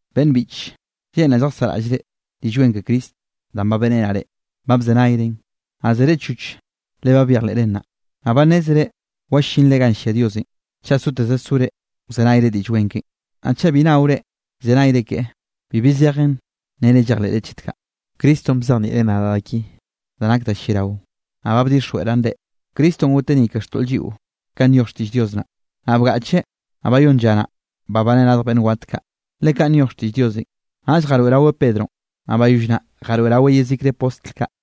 Beꞌnn biꞌche, lleꞌnraꞌ lljasaꞌraꞌllre Diꞌll Wen ke Cristonꞌ danꞌ ba beꞌrenaꞌ reꞌ. Ba bzenayren, naꞌ zere choch le ba byejleꞌren naꞌ. Naꞌ ba nnézere wallinre ganꞌ llia Diosenꞌ chaꞌ soteze sore wzenayre Diꞌll Wen keꞌen. Naꞌ chaꞌ bi naore llzenayre keꞌe, bibi zejen nnere llejleꞌre chet kaꞌ. Cristonꞌ bzejnieꞌreꞌ nadaꞌ da ki da nak da lliarao, naꞌ ba bdixjweꞌraꞌn reꞌ. Cristonꞌ goteꞌ ni ke xtoꞌl lliꞌo kanꞌ nyoj xtiꞌll Dios naꞌ. Naꞌ bgaꞌcheꞌ, naꞌ bayónn lla naꞌ, babaneꞌ radj beꞌnn wat kaꞌ, le kaꞌn nyoj xtiꞌll Diosenꞌ. Naꞌll jaroeꞌraweꞌ Pedronꞌ, naꞌ bayoll naꞌ jaroeꞌraweꞌ yezikre postl kaꞌ.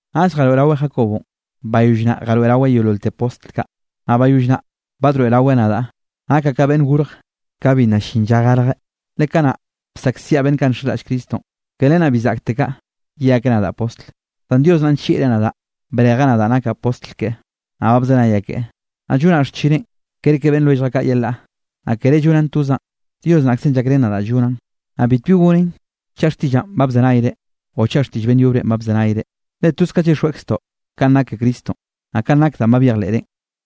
Naꞌll jaroeꞌraweꞌ Jacobonꞌ, bayoll naꞌ jaroeꞌraweꞌ yeololte postl kaꞌ. Naꞌ bayoll naꞌ badroeꞌraweꞌ nadaꞌ. Nakaꞌ ka beꞌnn gorje ka bi nna llin lla garjeꞌ. Le kanaꞌ bsaꞌkziaꞌ beꞌnn kaꞌ nxenraꞌll Cristonꞌ. Ke len naꞌ bi zaꞌktekaꞌ ye akeꞌ nadaꞌ postl. Zan Dios naꞌ nllieꞌreꞌ nadaꞌ brejeꞌ nadaꞌ nakaꞌ postl keꞌe, naꞌ ba bzenayaꞌ keꞌe, naꞌ llonllaꞌ xchineꞌn kerke beꞌnn lwelljaꞌ kaꞌ yelaꞌ. Naꞌ kere llonaꞌn tozaꞌn, Dios naꞌkzenꞌ llakrén nadaꞌ llonaꞌn. Naꞌ bitbi gonen chaꞌ xtiꞌllaꞌn ba bzenayre o chaꞌ xtiꞌll beꞌnn yobrenꞌ ba bzenayre, le toze kaꞌ llyixjweꞌkztoꞌ kanꞌ nak ke Cristonꞌ, naꞌ kaꞌn nak danꞌ ba byejleꞌrenꞌ.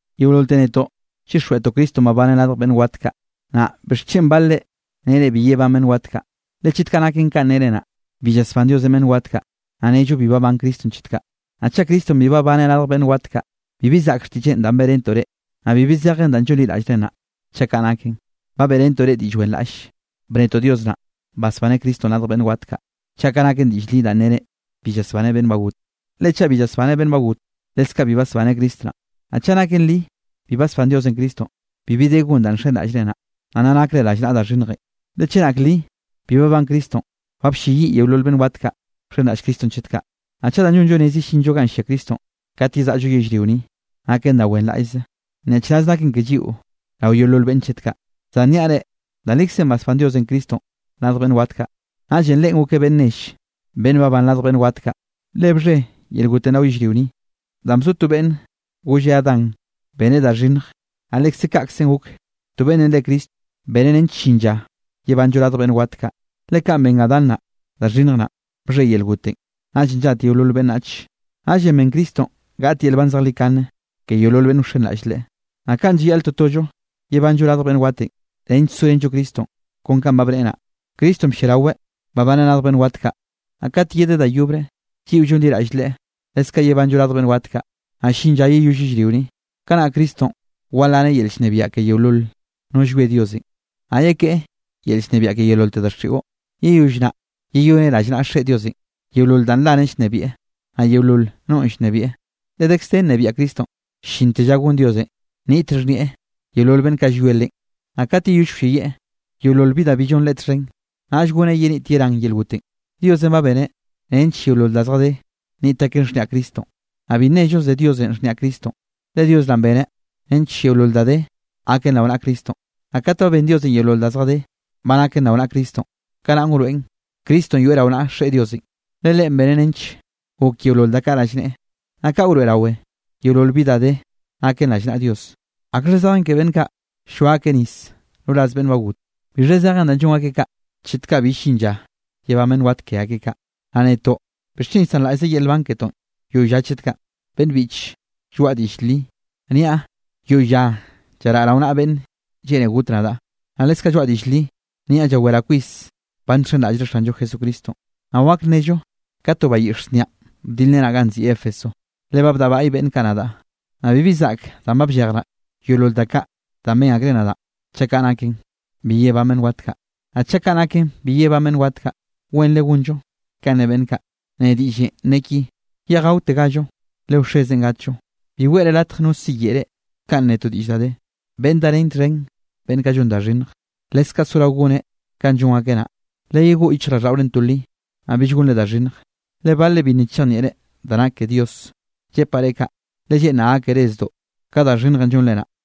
Yeololte netoꞌ llyixjweꞌtoꞌ Cristonꞌ babaneꞌ radj beꞌnn wat kaꞌ. Naꞌ ¿bixchen balre nere bi yebán beꞌnn wat kaꞌ? Le chet kaꞌ naken kanꞌ nere naꞌ, bi llasbán Diosenꞌ beꞌnn wat kaꞌ, naꞌ nnello bi babán Cristonꞌ chet kaꞌ. Naꞌ chaꞌ Cristonꞌ bi babaneꞌ radj beꞌnn wat kaꞌ, bibi zaꞌk xtiꞌlleꞌn danꞌ beꞌrentoꞌ reꞌ, naꞌ bibi zejen danꞌ llonliraꞌllreꞌ naꞌ, chaꞌ kaꞌ naken. Ba beꞌrentoꞌ reꞌ diꞌll wenraꞌll, bnetoꞌ Dios naꞌ basbaneꞌ Cristonꞌ radj beꞌnn wat, chaꞌ kaꞌ naken diꞌll li danꞌ nere bi llasbaneꞌ beꞌnn ba got. Le chaꞌ bi llasbaneꞌ beꞌnn ba got, leskaꞌ bi basbaneꞌ Cristo naꞌ. Naꞌ chaꞌ naken li bi basbán Diosenꞌ Cristonꞌ, bibi de gon danꞌ nxenraꞌllreꞌ naꞌ, naꞌ nna nakre rallnaꞌa da xhinnjenꞌ. Le chenak li bi babán Cristonꞌ, ba blleyiꞌ yeolol beꞌnn wat kaꞌ bxenraꞌll Cristonꞌ chet kaꞌ. Naꞌ chaꞌ danꞌ llonllo rez yellinllo ganꞌ llia Cristonꞌ kat yezaꞌllo yellrio ni, naken da wenraꞌllzenꞌ, nyaꞌchraz naken ke lliꞌo rao yeolol beꞌnne chet kaꞌ. Zan nnaꞌ niaꞌ reꞌ, da likzenꞌ basbán Diosenꞌ Cristonꞌ radj beꞌnn wat kaꞌ, naꞌllenꞌ Leꞌen gokeꞌ beꞌnn nell beꞌnn babán radj beꞌnn wat kaꞌ. Le bxhe yel gotenꞌ rao yellrio ni, danꞌ bzo to beꞌnn golle Adán beneꞌ da xhinnj, naꞌ lekze kaꞌkzenꞌ gok, to beꞌnne re Cristo beneꞌ nench llin lla yebanllo radj beꞌnn wat kaꞌ. Le kanꞌ ben Adán naꞌ da xhinnj naꞌn, bxhe yel gotenꞌ, naꞌllenꞌ llat yeolol beꞌnnach. Naꞌllenꞌ ben Cristonꞌ gaꞌt yel nban zejlikane ke yeolol beꞌnn wxenraꞌll Leꞌe. Naꞌ kanꞌ llayaꞌl totollo yebanllo radj beꞌnn watenꞌ nench sorenllo Cristonꞌ kon kanꞌ ba bneꞌe naꞌ. Cristonꞌ blliaraweꞌ babaneꞌ radj beꞌnn wat kaꞌ, naꞌ kat yedeꞌ da yobre, lliꞌo llonliraꞌll Leꞌe, leskaꞌ yebanllo radj beꞌnn wat kaꞌ. Naꞌ llin lla yeyoll yellrio ni. Kanaꞌ Cristonꞌ walaneꞌ yel llnebiaꞌ ke yeolol no llwie Diosenꞌ, naꞌ yekeꞌe yel llnebiaꞌ ke yeololte daxiꞌo. Yeyoll naꞌ yeyoneꞌ rallnaꞌa Xeꞌe Diosenꞌ yeolol da nlaneꞌ llnebieꞌ, naꞌ yeolol nonꞌ llnebieꞌ. Le dekz de nnebiaꞌ Cristonꞌ llinte lla gon Diosenꞌ nniꞌt xhnieꞌ yeolol beꞌnn kaꞌ llwie Leꞌen. Naꞌ kat yeyoll wlleyieꞌ yeolol bi da bi llon Leꞌe txhen, naꞌll goneꞌ yenit yerán yel gotenꞌ. Diosenꞌ ba beneꞌ nench yeolol da zjadé nniꞌt aken xhniaꞌ Cristonꞌ. Naꞌ bi nnello ze Diosenꞌ xhniaꞌ Cristonꞌ, le Dios naꞌ beneꞌ nench yeolol da de gaken rao naꞌa Cristonꞌ. Naꞌ kat ba ben Diosenꞌ yeolol da zjadé ba naken rao naꞌa Cristonꞌ, kanaꞌn wroeꞌn Cristonꞌ yoeꞌ rao naꞌa Xeꞌe Diosenꞌ. Le Leꞌen beneꞌ nench gok yeolol da kaꞌ rallneꞌe. Naꞌ kaꞌ wroeꞌrawe yeolol bi da de naken rallnaꞌa Dios. ¿Akxha zejen ke beꞌnn kaꞌ ll-lloa akeꞌ nis roraz beꞌnn ba got? ¿Bixha zejen da llon akeꞌ kaꞌ chet kaꞌ bi llin lla yebán beꞌnn wat ke akeꞌ kaꞌ? Naꞌ netoꞌ, ¿bixchen llsanraꞌllze yel nban ketoꞌ yoꞌy lla chet kaꞌ? Beꞌnn biꞌche, lloaꞌa diꞌll li, niaꞌ yoꞌy lla llaraꞌa rao naꞌa beꞌnn lleꞌne got nadaꞌ, naꞌ leskaꞌ lloaꞌa diꞌll li, niaꞌ llaweraꞌ kwis ba nxenraꞌllre Xanllo Jesucristo. Naꞌ wak nnello ka to bayiꞌx znianꞌ bdilrenaꞌ ganꞌ nziꞌi Éfeso, le ba bdaꞌbaꞌy beꞌnn kaꞌ nadaꞌ. Naꞌ bibi zaꞌk danꞌ ba bllejraꞌ yeolol da kaꞌ danꞌ ben akreꞌ nadaꞌ chaꞌ kaꞌ naken, bi yebán beꞌnn wat kaꞌ. Naꞌ chaꞌ kaꞌ naken bi yebán beꞌnn wat kaꞌ, wenre gonllo kanꞌ ne beꞌnn kaꞌ, ne diꞌllenꞌ ne ki: “Yeꞌj gaotegallo, le wxezenꞌ gatllo.” Bi weꞌre latj no siyeꞌe reꞌ kanꞌ ne to diꞌll da de: “Beꞌnn darén txhen beꞌnn kaꞌ llon da xhinnj, leskaꞌ sorao goneꞌ kanꞌ llon akeꞌ naꞌ.” Leyegoꞌ yichjraꞌlldaꞌorenꞌ to li, naꞌ bill gonre da xhinnj, le balre bi nna chejnieꞌre da nak ke Dios. Llepaꞌ reꞌ kaꞌ, le lleꞌnraꞌ gákere zdoꞌ ka da xhinnjenꞌ llonre naꞌ.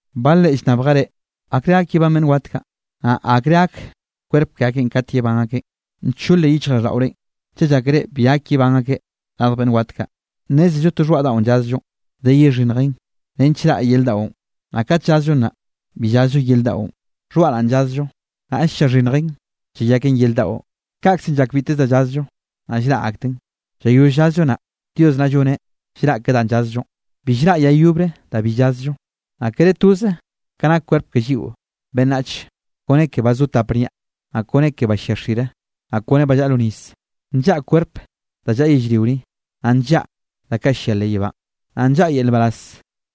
Balre llnnabjere: “¿Akrenꞌ gak yebán beꞌnn wat kaꞌ? Naꞌ ¿akre gak kwerp ke akeꞌn kat yebán akeꞌn?” Ncholje yichjraꞌlldaꞌorenꞌ chaꞌ llákere bi gak yebán akeꞌ radj beꞌnn wat kaꞌ. Nnézello to xhoaꞌ daꞌo llazllo de yexhinnjen nench raꞌ yer daꞌon. Naꞌ kat llazllo naꞌ, bi llazllo yer daꞌon, xhoaꞌ naꞌ llazllo, naꞌll llaxhinnjen llayaken yer daꞌo. Kaꞌkze llak biteze da llazllo, naꞌ llraꞌ akten. Llayoll llazllo naꞌ, Dios naꞌ lloneꞌ llraꞌ ke danꞌ llazllonꞌ, bi llraꞌ yay yobre da bi llazllo. Naꞌ kere toze ka nak kwerp ke lliꞌo beꞌnnach kone ke ba zo tap niaꞌ, naꞌ kone ke ba llia xire, naꞌ kone ba llaꞌa lo nis. Nllaꞌa kwerp da llaꞌa yellrio ni, naꞌ nllaꞌa da kaꞌ llia leꞌ yebánꞌ. Naꞌ nllaꞌa yel nbaraz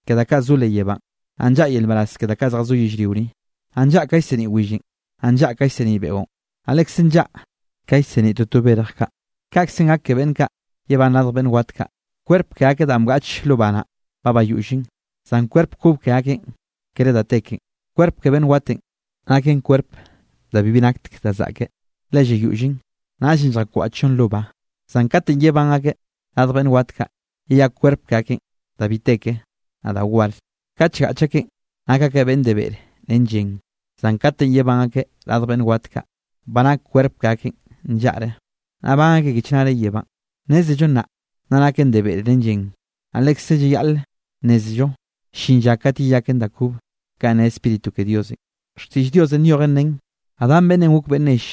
ke da kaꞌ zo leꞌ yebánꞌ, naꞌ nllaꞌa yel nbaraz ke da zjazó yellrio ni. Naꞌ nllaꞌa ka llseniꞌ willenꞌ, naꞌ nllaꞌa ka llseniꞌ beꞌon, naꞌ lekze nllaꞌa ka llseniꞌ toto berj kaꞌ. Kaꞌkze gak ke beꞌnn kaꞌ yebán radj beꞌnn wat kaꞌ. Kwerp ke akeꞌ danꞌ bgaꞌch lo ba naꞌn ba bayollen, zan kwerp kob ke akeꞌn kere da te kenꞌ. Kwerp ke beꞌnn watenꞌ naken kwerp da bibi nakteke da zaꞌke, le llayollen, naꞌllenꞌ lljakwaꞌchllon lo ba. Zan kate yebán akeꞌ radj beꞌnn wat kaꞌ, yeyak kwerp ke akeꞌn da bi te ke, naꞌ da war. Katenꞌ llgaꞌch akeꞌn nak akeꞌ de beꞌre ren llen, zan kate yebán akeꞌ radj beꞌnn wat kaꞌ, ba nak kwerp ke akeꞌn nllaꞌre, naꞌ ban akeꞌ ke chnare yebánꞌ. Nnézello nnaꞌ nna naken de beꞌre ren llen, naꞌ lekze llayaꞌl nnézello llin lla kate yeyaken da kobe kanꞌ ne Spíritu ke Diosenꞌ. Xtiꞌll Diosenꞌ nyojen nen: “Adán beꞌnnenꞌ gok beꞌnn nell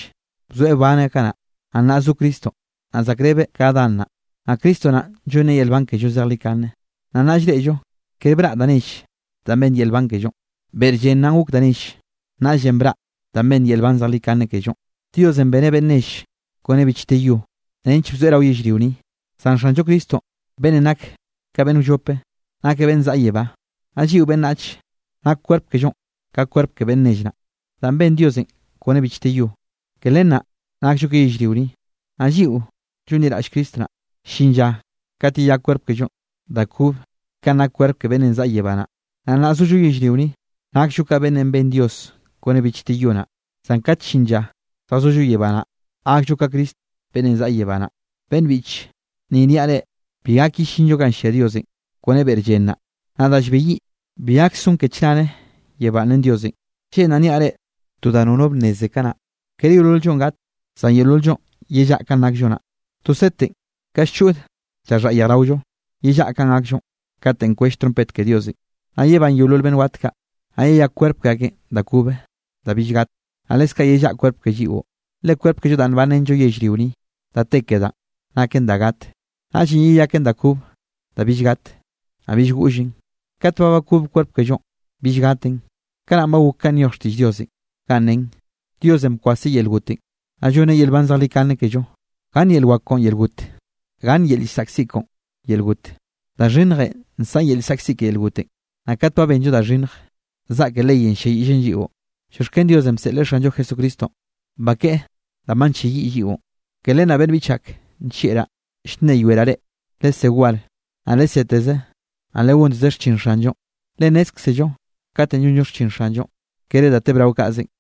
bzoeꞌ wbaneꞌ kanaꞌ.” Naꞌ nnaꞌ zo Cristo, naꞌ zaꞌkrebeꞌ ka Adán naꞌ, naꞌ Cristo naꞌn llonn yel nban kello zejlikane. Naꞌ nnaꞌ llreꞌllo kere braꞌ da nell danꞌ benn yel nban kellonꞌ, beꞌr llen naꞌn gok da nell. Naꞌllenꞌ braꞌ danꞌ benn yel nban zejlikane kellonꞌ. Diosenꞌ beneꞌ beꞌnn nell kone bichte yo, nench bzoeꞌ rao yellrio ni, zan Xanllo Cristo beꞌnnenꞌ nakeꞌ ka beꞌnn wllop, nakeꞌ beꞌnnenꞌ zaꞌa yebá. Naꞌ lliꞌo beꞌnnach nak kwerp kellonꞌ ka kwerp ke beꞌnn nell naꞌ, danꞌ ben Diosenꞌ kone bichte yo, ke len naꞌ nakllo ke yellrio ni. Naꞌ lliꞌo llonliraꞌll Cristo naꞌ, llin lla kate yeyak kwerp kellonꞌ da kobe kanꞌ nak kwerp ke beꞌnnenꞌ zaꞌa yebá naꞌ. Nnaꞌ nna zollo yellrio ni, nakllo ka beꞌnnenꞌ ben Diosenꞌ kone bichte yo naꞌ, zan kat llin lla lljazollo yebá naꞌ, gakllo ka Cristo beꞌnnenꞌ zaꞌa yebá naꞌ. Beꞌnn biꞌche, ni nniaꞌ reꞌ bi gak yellinllo ganꞌ llia Diosenꞌ kone beꞌr llen naꞌ, naꞌ da llbeyiꞌ bi gak son ke chnare yebánꞌ ren Diosenꞌ. Lleꞌnraꞌ nniaꞌ reꞌ to da nono bnneze kanaꞌ, kere yeolol-llonꞌ gat, zan yeolol-llonꞌ yellaꞌa kanꞌ nakllo naꞌ. To setenꞌ ka llchod llaxhaꞌ yejraollonꞌ, yellaꞌa kanꞌ gakllo katenꞌ kwell trompet ke Diosenꞌ. Naꞌ yebán yeolol beꞌnn wat kaꞌ, naꞌ yeyak kwerp ke akeꞌn da kobe da bill gat, naꞌ leskaꞌ yellaꞌa kwerp ke lliꞌo. Le kwerp kello danꞌ nbanrenllo yellrio ni, da te ke danꞌ. Naken da gat, naꞌllenꞌ yeyaken da kobe da bill gat, naꞌ bill goꞌllen. Kat ba bakob kwerp kellonꞌ bill gaten, kanaꞌn ba gok kanꞌ nyoj xtiꞌll Diosenꞌ ganꞌ nen: “Diosenꞌ bkwaseꞌ yel gotenꞌ, naꞌ llonneꞌ yel nban zejlikane kello. ¿Gann yel wak koꞌon, yel got? ¿Gann yel llsaꞌkziꞌ koꞌon, yel got?” Da xhinnjenꞌ nsaꞌn yel llsaꞌkziꞌ ke yel gotenꞌ. Naꞌ kat ba benllo da xhinnje, zaꞌke leyenꞌ ll-lliayiꞌllen lliꞌo. Llioxken Diosenꞌ bseꞌleꞌ Xanllo Jesucristonꞌ bakeꞌe danꞌ ba nlleyiꞌ lliꞌon. Ke len naꞌ beꞌnn biꞌch ak nllieꞌraꞌ, llnneyoeraꞌ reꞌ, lesé war, naꞌ leseteze, naꞌ legonteze xchin Xanllonꞌ, le nnézkzello katenꞌ llonllo xchin Xanllonꞌ, kere da tebrao kaꞌzenꞌ.